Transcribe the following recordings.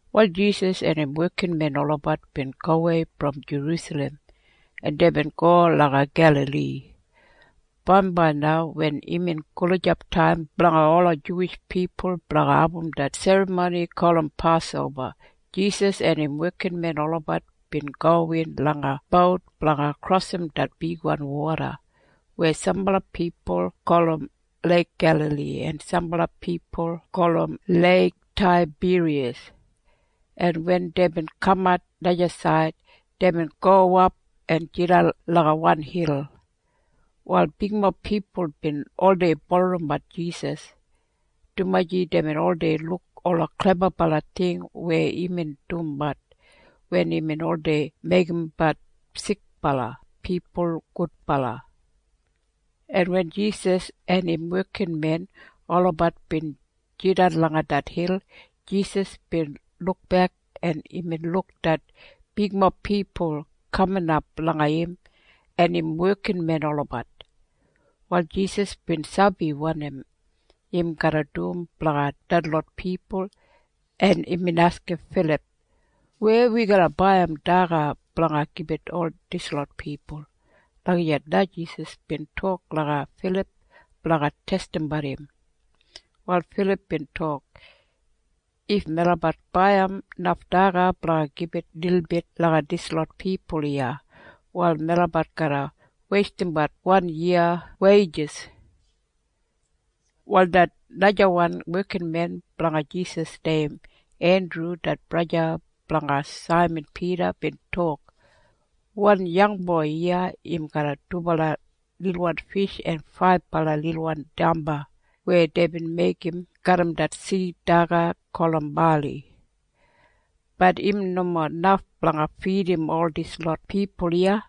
Wal Jisas en im wekinmen olabat bin gowei brom Jerusalem, en deibin go langa Gelali. Bambai na wen imbin gulijap taim blanga ola Juwish pipul blanga abum det serramoni gulum Pasoba, Jisas en im wekinmen olabat bin gowin langa bout blanga krosim det bigwan woda weya sambala pipul gulum Leik Gelali en sambala pipul gulum Leik Taibiriyas, en wen deibin kamat najasaid, deibin gowap en jidan langa wan hil. Wal bigmob pipul bin oldei bulurrumbat Jisas, dumaji deibin oldei luk ola klebabala ting weya imbin dumbat wen imbin oldei meigimbat sikbala pipul gudbala, en wen Jisas en im wekinmen olabat bin jidan langa det hil, Jisas bin lukbek, en imbin luk det bigmob pipul kaminap langa im en im wekinmen olabat. Wal Jisas bin sabi wanim im garra dum blanga detlot pipul, en imbin askim Filip, “Weya wi garra baiyim daga blanga gibit ol dislot pipul?” Lagijat na Jisas bin tok langa Filip blanga testimbat im. Wal Filip bin tok, “If melabat baiyim naf daga blanga gibit lilbit langa dislot pipul iya, wal melabat garra weistimbat wan yiya weijis.” Wal det najawan wekinmen blanga Jisas neim Endru det braja blanga Saiman Pida bin tok, “Wan yangboi iya im garram dubala lilwan fish en faibala lilwan damba weya deibin meigim garram det sid daga gulum bali. Bat im nomo naf blanga fidim ol dislot pipul iya.”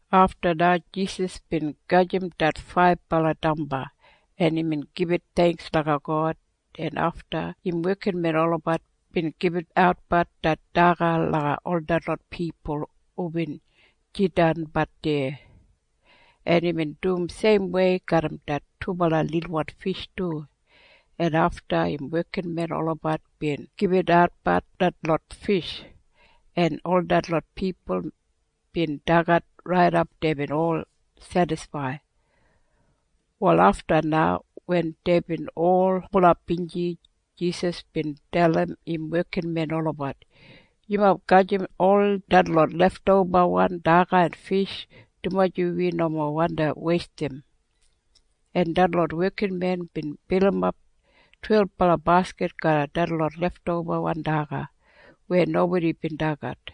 Afta na Jisas bin gajim det faibala damba, en imbin gibit theingks langa God, en afta im wekinmen olabat bin gibitatbat det daga langa ol detlot pipul hubin jidanbat deya. En imbin dum seimwei garram det dubala lilwan fish du, en afta im wekinmen olabat bin gibitatbat detlot fish, en ol detlot pipul bin dagat raidap deibin ol sedisfaid. Wal afta na wen deibin ol bulap binji, Jisas bin dalim im wekinmen olabat, “Yumob gajim ol detlot leftobawan daga en fish, dumaji wi nomo wandi weistim.” En detlot wekinmen bin bilimap twelbala baskit garram detlot leftobawan daga weya nobodi bin dagat.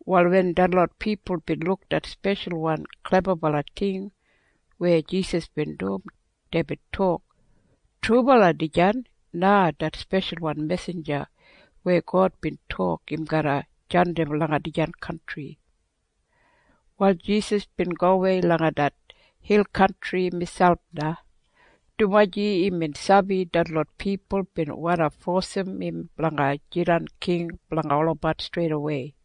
Wal wen detlot pipul bin luk det speshalwan klebabala ting weya Jisas bin dum, deibin tok, “Trubala dijan na det speshalwan mesinja weya God bin tok im garra jandim langa dijan kantri.” Wal Jisas bin gowei langa det hil kantri miselp na, dumaji imbin sabi detlot pipul bin wandi fosim im blanga jidan king blanga olabat streidawei.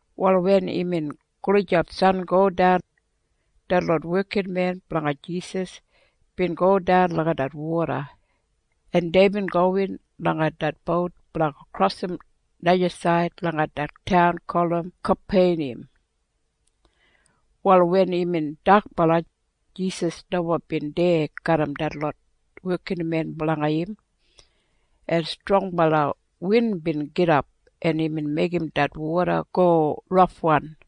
Wal wen imbin gulijap sangodan, detlot wekinmen blanga Jisas bin godan langa det woda, en deibin gowin langa det bout blanga krosim najasaid langa det taun gulum Kapeniyam. Wal wen imbin dakbala, Jisas nomo bin deya garram detlot wekinmen blanga im, en strongbala win bin gidap, en imbin meigim det woda go rafwan,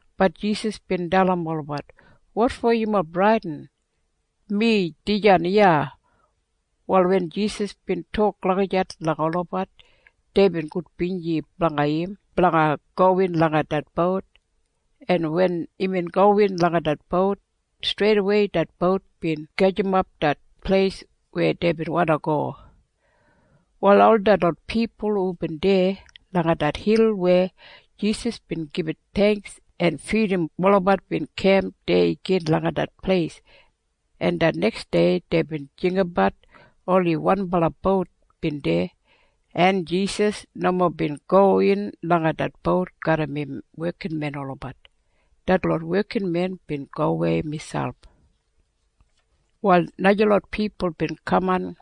Bat Jisas bin dalim olabat, “Wotfo yumob bradin? Mi dijan iya.” Wal wen Jisas bin tok lagijat langa olabat, deibin gudbinji blanga im blanga gowin langa det bout. En wen imbin gowin langa det bout, streidawei det bout bin gajimap det pleis weya deibin wandi go. Wal ol detlot pipul hubin deya langa det hil weya Jisas bin gibit theingks en fidim olabat bin kemp deya gin langa det pleis, en det neksdei deibin jinggabat oni wanbala bout bin deya, en Jisas nomo bin gowin langa det bout garram im wekinmen olabat. Detlot wekinmen bin gowei miselp. Wal najalot pipul bin kaman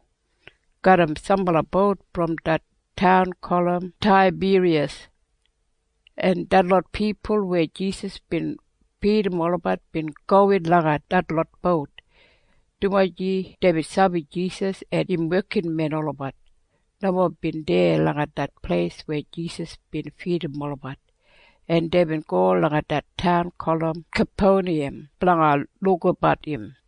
garram sambala bout brom det taun gulum Taibiriyas, en detlot pipul weya Jisas bin fidim olabat bin gowin langa detlot bout, dumaji deibin sabi Jisas en im wekinmen olabat nomo bin deya langa det pleis weya Jisas bin fidim olabat, en deibin go langa det taun gulum Kapeniyam blanga lukabat im.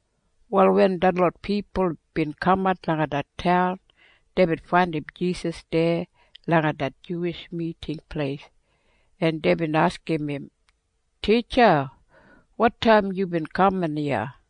Wal wen detlot pipul bin kamat langa det taun, deibin faindim Jisas deya langa det Juwish Miting Pleis, en deibin askim im, “Titja, wotaim yubin kaman iya?”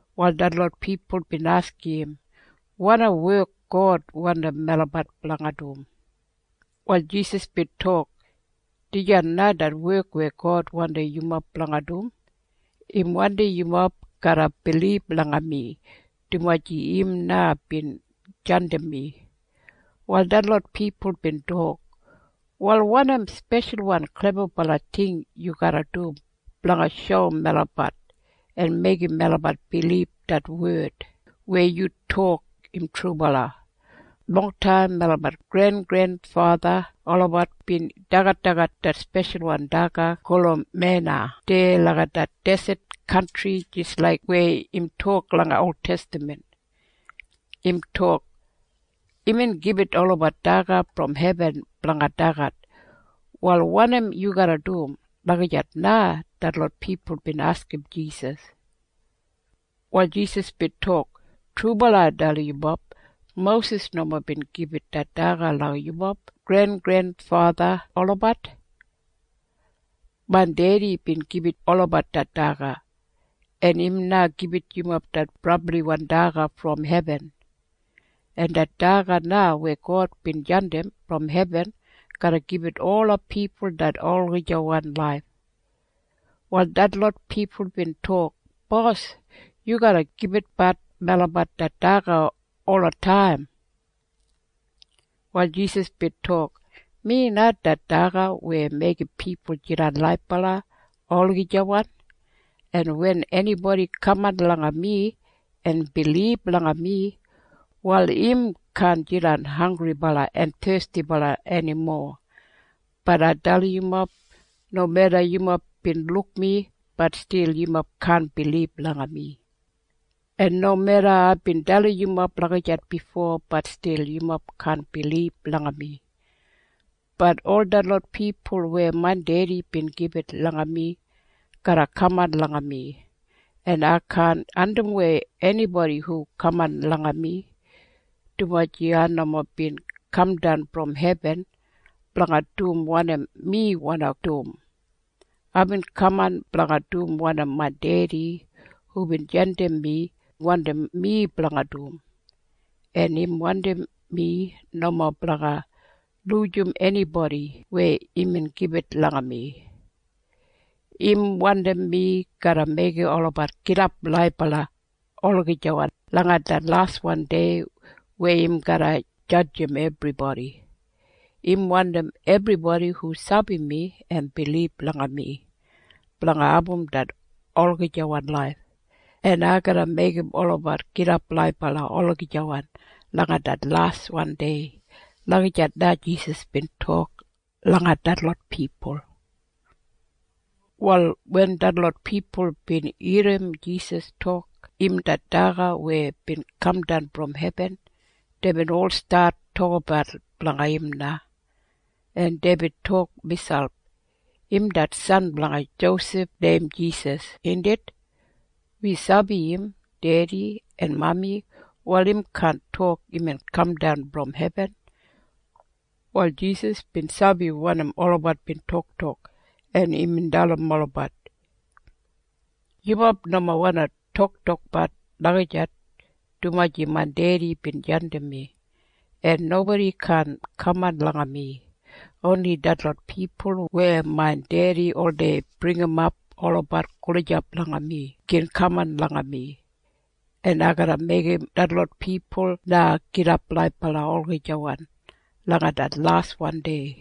Wal detlot pipul bin askim im, “Wanim wek God wandim melabat blanga dum?” Wal Jisas bin tok, “Dijan na det wek weya God wandim yumob blanga dum. Im wandim yumob garra bilib langa mi, dumaji im na bin jandim mi.” Wal detlot pipul bin tok, “Wal wanim speshalwan klebabala ting yu garra dum blanga shoum melabat en meigim melabat bilib det wed weya yu tok im trubala? Longtaim melabat grengrenfatha olabat bin dagadagat det speshalwan daga gulum mena deya langa det deset kantri jis laik weya im tok langa oltestaman. Im tok, ‘Imbin gibit olabat daga brom hebin blanga dagat.’ Wal wanim yu garra dum?” Lagijat na detlot pipul bin askim Jisas. Wal Jisas bin tok, “Trubala ai dalim yumob. Mosis nomo bin gibit det daga langa yumob grengrenfatha olabat. Main Dedi bin gibit olabat det daga. En im na gibit yumob det brabliwan daga brom hebin. En det daga na weya God bin jandim brom hebin garra gibit ola pipul det olagijawan laif.” Wal detlot pipul bin tok, “Bos, yu garra gibitbat melabat det daga olataim.” Wal Jisas bin tok, “Mi na det daga weya meigim pipul jidan laibala olagijawan. En wen enibodi kaman langa mi en bilib langa mi, wal im kaan jidan hanggribala en thestibala enimo. Bat ai dalim yumob. Nomeda yumob bin luk mi, bat stil yumob kaan bilib langa mi. En nomeda aibin dalim yumob lagijat bifo, bat stil yumob kaan bilib langa mi. Bat ol detlot pipul weya main Dedi bin gibit langa mi garra kaman langa mi, en ai kaan andimwei enibodi hu kaman langa mi, dumaji ai nomo bin kamdan brom hebin blanga dum wanim mi wandi dum. Aibin kaman blanga dum wanim main Dedi hubin jandim mi wandim mi blanga dum, en im wandim mi nomo blanga lujim enibodi weya imbin gibit langa mi. Im wandim mi garra meigim olabat gidap laibala olagijawan langa det laswan dei weya im garra jadjim ebribodi. Im wandim ebribodi hu sabi mi en bilib langa mi blanga abum det olagijawan laif, en ai garra meigim olabat gidap laibala olagijawan langa det laswan dei.” Lagijat na Jisas bin tok langa detlot pipul. Wal wen detlot pipul bin irrim Jisas tok im det daga weya bin kamdan brom hebin, deibin ol stat tokabat blanga im na, en deibin tok miselp, “Im det san blanga Josef neim Jisas, indit? Wi sabi im dedi en mami. Wal im kaan tok imbin kamdan brom hebin.” Wal Jisas bin sabi wanim olabat bin toktok, en imbin dalim olabat, “Yumob nomo wandi toktokbat lagijat, dumaji main Dedi bin jandim mi, en nobodi kaan kaman langa mi. Oni detlot pipul weya main Dedi oldei bringimap olabat gulijap langa mi gin kaman langa mi. En ai garra meigim detlot pipul na gidap laibala olagijawan langa det laswan dei.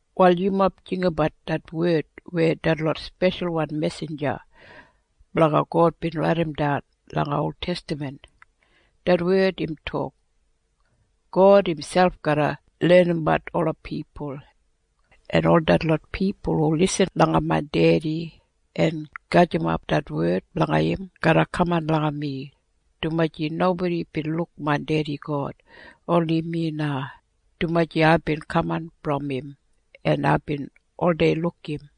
“Wal yumob jinggabat det wed weya detlot speshalwan mesinja blanga God bin raidimdan langa oltestaman. Det wed im tok, ‘God imselp garra lenimbat ola pipul.’ En ol detlot pipul hu lisin langa main Dedi en gajimap det wed blanga im garra kaman langa mi, dumaji nobodi bin luk main Dedi God, oni mi na, dumaji aibin kaman brom im, en aibin oldei luk im.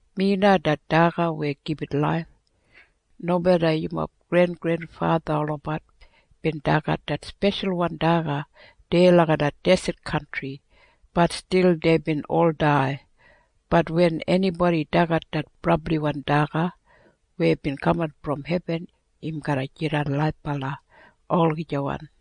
Mi na det daga weya gibit laif. Nomeda yumob grengrenfatha olabat bin dagat det speshalwan daga deya langa det deset kantri, bat stil deibin ol dai. Bat wen enibodi dagat det brabliwan daga weya bin kamdan brom hebin, im garra jidan laibala olagijawan.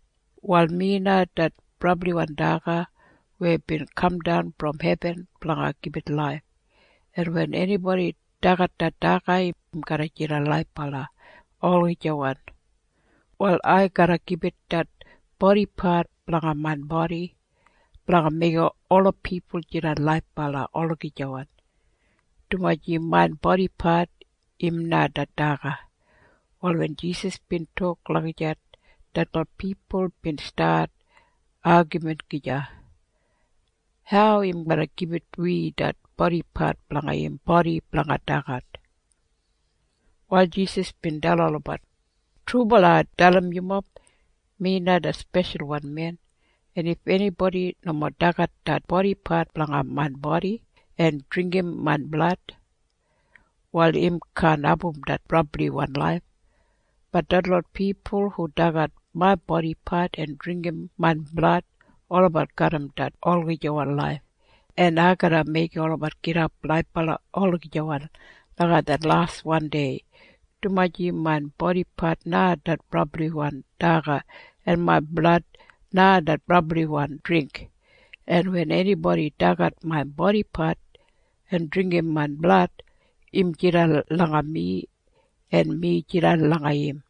“Wal mi na det brabliwan daga weya bin kamdan brom hebin blanga gibit laif, en wen enibodi dagat det daga, im garra jidan laibala olagijawan. “Wal ai garra gibit det bodipat blanga main bodi blanga meigim ola pipul jidan laibala olagijawan, dumaji main bodipat im na det daga.” Wal wen Jisas bin tok lagijat, detlot pipul bin stat agamin gija, “Hau im garra gibit wi det bodipat blanga im bodi blanga dagat?” Wal Jisas bin dalim olabat, “Trubala ai dalim yumob. Mi na det Speshalwan Men, en if enibodi nomo dagat det bodipat blanga main bodi en dringgim main blad, wal im kaan abum det brabliwan laif. Bat detlot pipul hu dagat main bodipat en dringgim main blad, olabat garram det olagijawan laif, en ai garra meigim olabat gidap laibala olagijawan langa det laswan dei, dumaji main bodipat na det brabliwan daga, en main blad na det brabliwan dringk, en wen enibodi dagat main bodipat en dringgim main blad, im jidan langa mi en mi jidan langa im.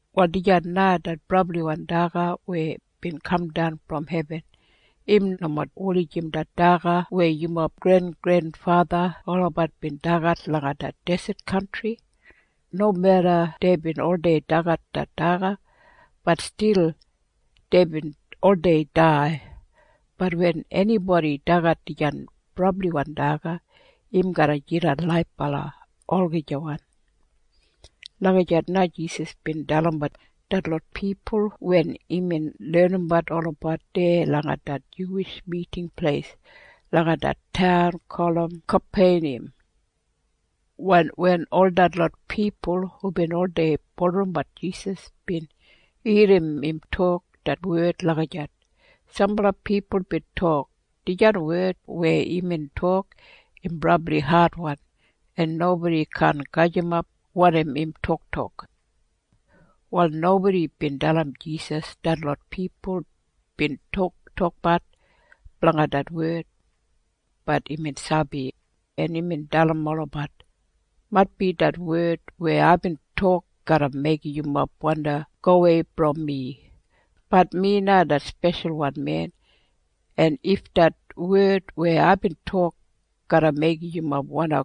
“Wal dijan na det brabliwan daga weya bin kamdan brom hebin. Im nomo wulijim det daga weya yumob grengrenfatha olabat bin dagat langa det deset kantri. Nomeda deibin oldei dagat det daga, bat stil deibin oldei dai. Bat wen enibodi dagat dijan brabliwan daga, im garra jidan laibala olagijawan.” Lagijat na Jisas bin dalimbat detlot pipul wen imbin lenimbat olabat deya langa det Juwish Miting Pleis langa det taun gulum Kapeniyam. Wal wen ol detlot pipul hubin oldei bulurrumbat Jisas bin irrim im tok det wed lagijat, sambala pipul bin tok, “Dijan wed weya imbin tok im brabli adwan, en nobodi kaan gajimap wanim im toktok.” Wal nobodi bin dalim Jisas detlot pipul bin toktokbat blanga det wed. Bat imbin sabi, en imbin dalim olabat, “Maitbi det wed weya aibin tok garra meigim yumob wandi gowei brom mi. Bat mi na det Speshalwan Men. En if det wed weya aibin tok garra meigim yumob wandi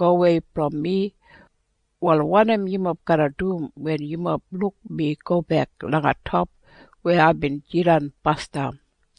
gowei brom mi, wal wanim yumob garra dum wen yumob luk mi gobek langa top weya aibin jidan basdam?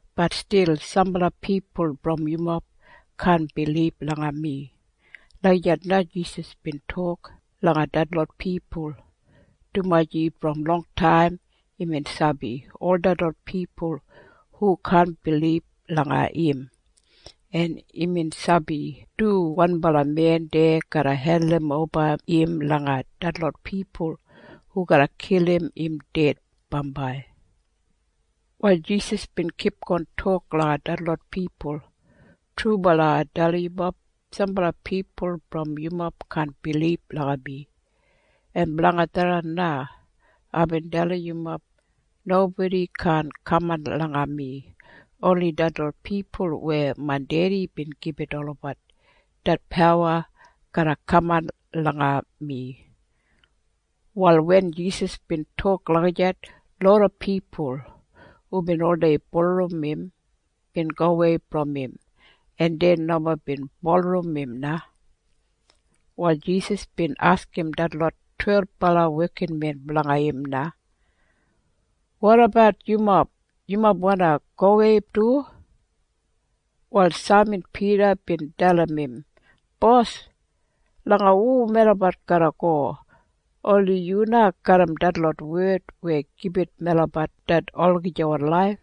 Bat stil sambala pipul brom yumob kaan bilib langa mi.” Lagijat na Jisas bin tok langa detlot pipul, dumaji brom longtaim imbin sabi ol detlot pipul hu kaan bilib langa im, en imbin sabi du wanbala men deya garra hendimoba im langa detlot pipul hu garra kilim im ded bambai. Wal Jisas bin kipgon tok langa detlot pipul, “Trubala ai dalim yumob. Sambala pipul brom yumob kaan bilib langa mi. En blanga tharran na aibin dalim yumob nobodi kaan kaman langa mi. Oni detlot pipul weya main Dedi bin gibit olabat det pawa garra kaman langa mi.” Wal wen Jisas bin tok lagijat, loda pipul hubin oldei bulurrum im bin gowei brom im, en dei nomo bin bulurrum im na. Wal Jisas bin askim detlot twelbala wekinmen blanga im na, “Wotabat yumob? Yumob wandi gowei du?” Wal Saiman Pida bin dalim im, “Bos, langa hu melabat garra go? Oni yu na garram detlot wed weya gibit melabat det olagijawan laif.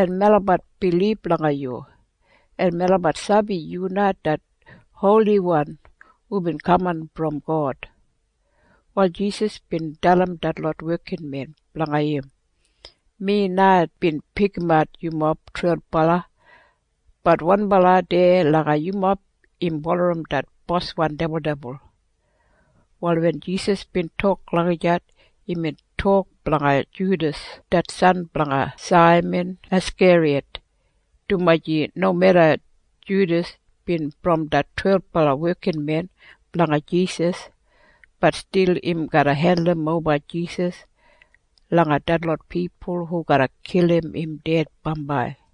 En melabat bilib langa yu, en melabat sabi yu na det Holiwan hubin kaman brom God.” Wal Jisas bin dalim detlot wekinmen blanga im, “Mi na bin pikimat yumob twelbala. Bat wanbala deya langa yumob im bulurrum det boswan dibuldibul.” Wal wen Jisas bin tok lagijat, imbin tok blanga Judas det san blanga Saiman Askeriyat, dumaji nomeda Judas bin brom det twelbala wekinmen blanga Jisas, bat stil im garra hendimoba Jisas langa detlot pipul hu garra kilim im ded bambai.